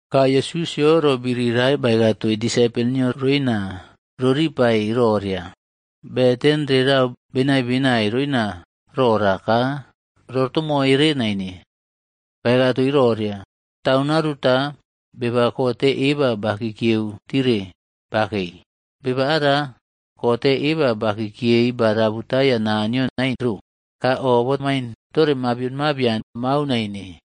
Ka Yesusꞌyo roꞌbiri rae baeka toii disaipol nio roina roripai roria, beten rerau benaiꞌbenai roina rora ka rotomoire naine. Baeka toii roria, “Taun aruta, beba kote eba bakikieu tire bakei. Beba ara kote eba ba kikiyei ba rabutaya Naniyo nain ro ka o bamain tore mabion mabian mau naine.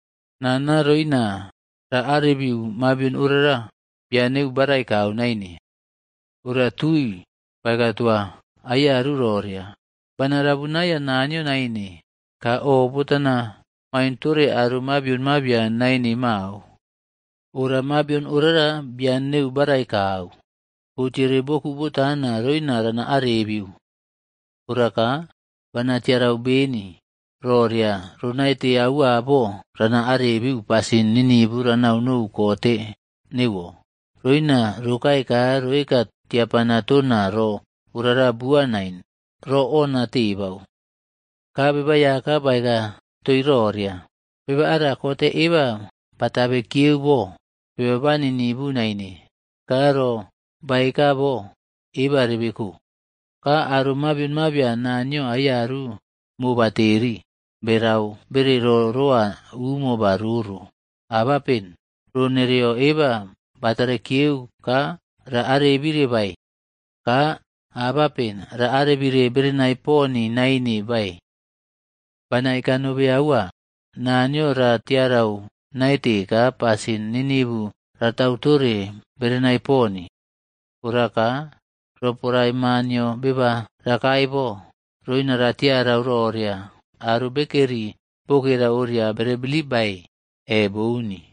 “Nana ronia raꞌarebiu mabion orara bian neu barai kau naine. Ora tui baeka toa aiyaru roria, ‘Bana rabunaiya Naniyo naine, ka o botana main tore aro mabion mabian naine mao. Ora mabion orara bian neu barai kau, botiere boku botana roina rana arebiu. Ora ka, bana tiarau beni roria ronaite aua bo rana arebiu pasin ninivu ranaunou kote neuwo, roina rokae ka roeka tiapana tona ro orara bua nain roꞌonina tebau.’” Ka Beba Aiyaka baeka toii roria, “Beba ara kote eba batabe kiyeu bo beba ba ninivu naine ka ro baeka bo eba rebeko. Ka aro mabion mabian Naniyo aiyaru mobateri, berau bere roo rowa umo ba roro. Abapen roo nereo eba ratare kiyeu ka ra arebire bae? Ka abapen ra arebire berenai poni naine bae? Bana eka nobe aua, Naniyo ra tiarau naite ka pasin ninivu ratautore berenai poni. Ora ka, roporae Ma nio beba rakae bo, roina ratiarau roria aro bekeri bokera oria bere bilip baeꞌe bouni?”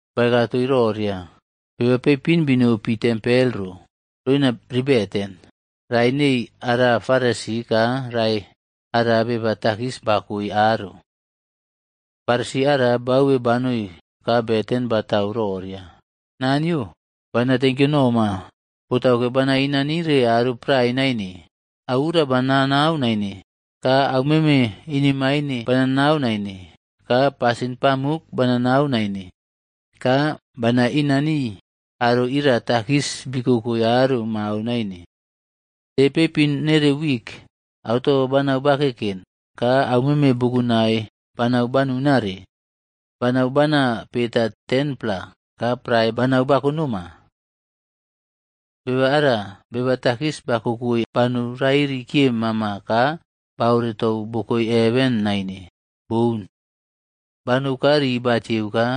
Baeka toii roria, “Beba peipin binopi tempel ro roina riꞌbeten. Rae nei ara Farisi ka rae ara beba takis bakoe aro. Farisi ara bauwe banou ka beten batau roria, ‘Naniyo, bana tenkyo noma botauke bana inanire aro prae naine. Auura bananau naine, ka aumeme inemaine bananau naine ka pasin pamuk bananau naine. Ka bana inanii aro ira takis bikokoi aro mao naine. De peipin nere wik, auto banau bakeken ka aumeme bukunai banau banunare, banau bana peta 10-pla ka prae banau bakonoma.’ “Beba ara beba takis bakokoi banou rairi kiye mama ka baoretou bokoe heven naine, boun. Banou ka ri batieua ka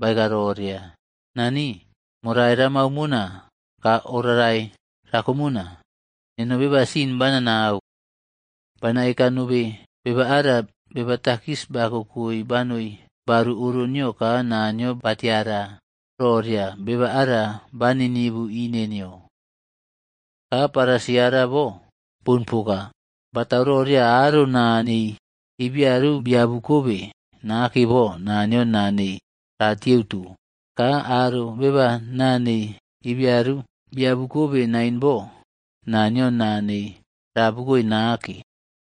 baeka roria, ‘Nani morai ramau mona ka oꞌrarai rakomona. Neno beba sin bananau.’ “Bana eka nobe beba ara beba takis bakokoi banoi baru oro nio ka Naniyo ba tiara roria beba ara ba ninivu ine nio. Ka Farisi ara bo, boun poka. Botau roria aro naa nei ibiaru biabuꞌkobe nake bo Naniyo naa nei ratieuto, ka aro beba naa nei ibiaru biabukobe naine bo, Naniyo naa nei ra abukoe nake.”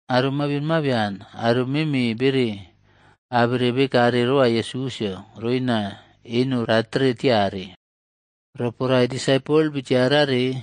Aro mabion mabian aro meme bere abere bekare roa Yesusꞌyo roina eno ratere tiare. Roporae disapol bitiarare,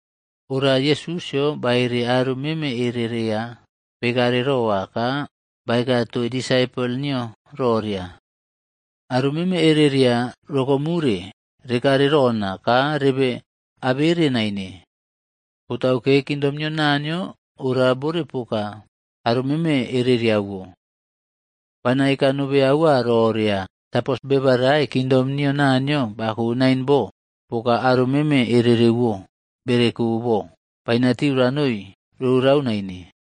Ora, Yesusꞌyo baere aro meme ereria bekare roa ka baeka toii disaipol nio roria, “Aro meme ereria rokomure rekare rona ka rebe abere naine. Botauke kingdom nio Naniyo ora bore poka aro meme ereriawo. Bana eka nobe aua roria, sapos beba rae kingdom nio Naniyo bako naine bo, poka aro meme ererwo bereko bo, bainatiu ranoi rorau naine.”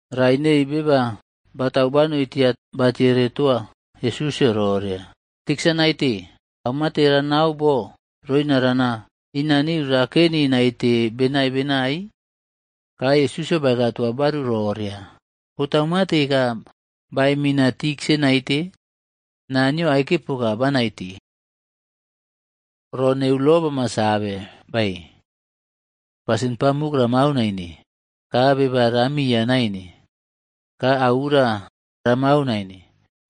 Rae neii beba batau banoi tia batiere toa Yesusꞌyo roria, “Tiksa naite, au mate ranau bo roina rana inaniu raken naite benai benai?” Ka Yesusꞌyo baeka toa baru roria, “Botau mate ka baemina tiksa naite? Naniyo aike poka banaite. Ro neu Lo bama save bae, ‘Pasin pamuk ramau naine, ka beba ramiya naine, ka auura ramau naine,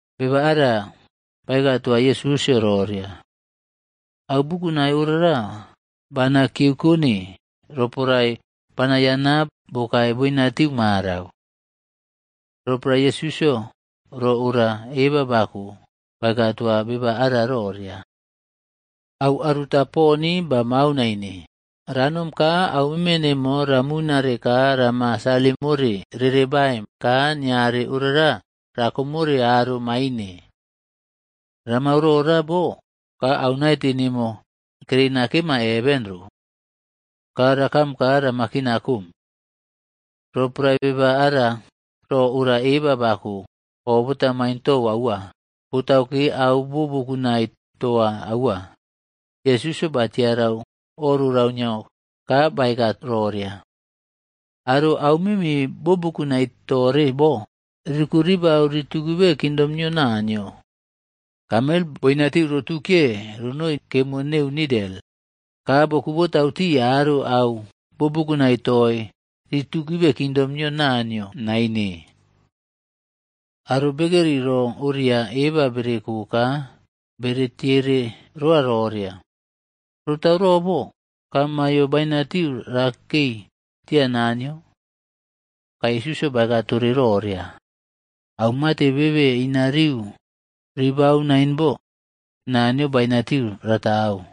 Beba ara baeka toa Yesusꞌyo roria, “Au bukunai ora bana kiyeukone roporae banayana bokae boinatiu marau.” Roporae Yesusꞌyo ro ora eba bako, baeka toa beba ara roria, “Au aruta poni bamau naine. Ranom ka aumeme nemo ramunare ka rama salim more rere baim ka niare orara rakomore aro maine. Ramau rora bo ka au naite nemo kereina kema heven ro. Ka rakam ka rama kina kom.” Roporae beba ara ro ora eba bako, o bota maintou aua. Botauke au bo bukunai toa aua. Yesusꞌyo batiarau o rorau nio ka baeka roria, “Aro aumeme bo bukunai tore bo, rikuꞌribau ritukibe kingdom nio Naniyo. Kameld boinatiu rotukiye ronoi kemo neu nidel, ka bokuꞌbotau tii aro au bobukunai toii ritukibe kingdom nio Naniyo naine.” Aro bekeri ro oria eba bereko ka bere tiere roa roria, “Rotau rora bo, ka maiyo bainatiu rakei tia Naniyo?” Ka Yesusꞌyo baeka tore roria, “Au mate bebe inariu reberau nain bo, Naniyo bainatiu ratau.”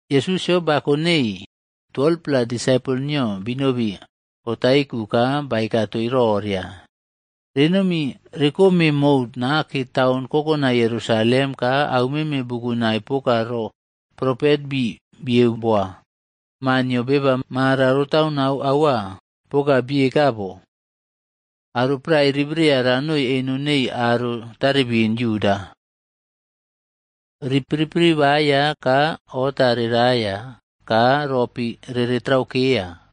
Yesusꞌyo bako nei 12-pla disaipol nio binobi otaiku ka baeka toii roria, “Renomi rekome mou nake taun kokonai Yerusalem ka aumeme bukunai poka ro propet bii bieu boa Maa nio Beba marau roꞌtaunau aua poka bieka bo. Aro prae ribreya ranoi eno neii aro tarebin Yuda. Ri piripiriꞌbaiya ka ota reraia ka ropi reretraukeya.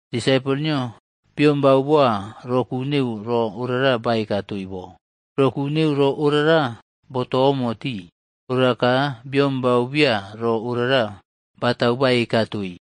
Disaipol nio biombau boa roku neu ro orara baeka toii bo. Roku neu ro orara botomo tii. Ora ka biombau bia ro orara batau baeka toii.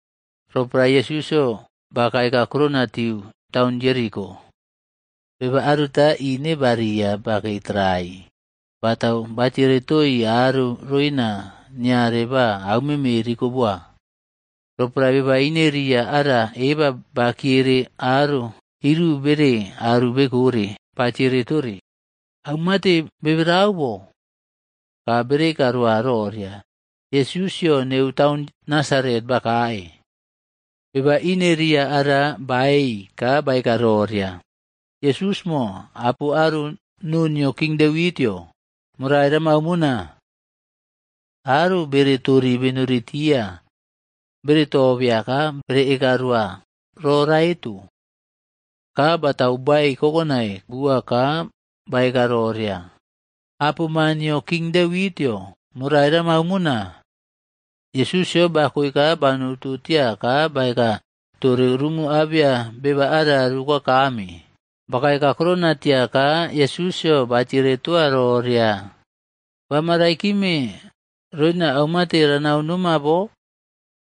Roporae Yesusꞌyo bakae kakurona tiu taun Jeriko, beba aruta ine baria bakei tarai batau batiere toii aro roina niare ba aumeme rikoboa. Roporae beba ineria ara eba bakiere aro iru bere aru bekore batiere tore, “Aumate keberau bo?” Ka bere eka roa roria, “Yesusꞌyo neu taun Nasaret bakae.” Beba ineria ara baei ka baeka roria, “Yesusꞌmo apo aro noo nio King Devitꞌyo, morai ramau mona.” Aro bere tori benori tia bere tobeya ka bere eka roa ro raeto. Ka batau baei kokonai bua ka baeka roria, “Apo ma nio King Devitꞌyo, morai ramau mona.” Yesusꞌyo bakoe ka banouꞌto tia ka baeka tore rumu abeya beba ara rukoakame. Bakae kakurona tia ka, Yesusꞌyo batiere toa roria, “Bama raikime roina aumate ranau noma bo?”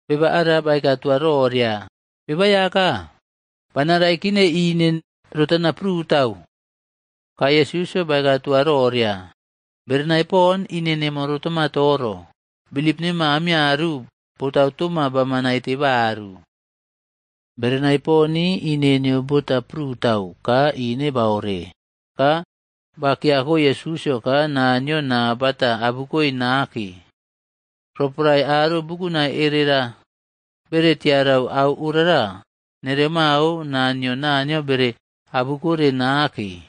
Beba ara baeka toa roria, “Beba Aiyaka, bana raikine ine rotana prutau.” Ka Yesusꞌyo baeka toa roria, “Berenai pon ine nemo rotama toro. Bilip nemo aiyaru botau toma bama naite baru.” Berenai poni ine nio bota prutau ka ine baore ka ba kiyakoe Yesusꞌyo ka Naniyo naa bata abukoe nake. Roporae aro bukunai erera bere tiarau au orara, nere mao naa nio Naniyo bere abukore nake.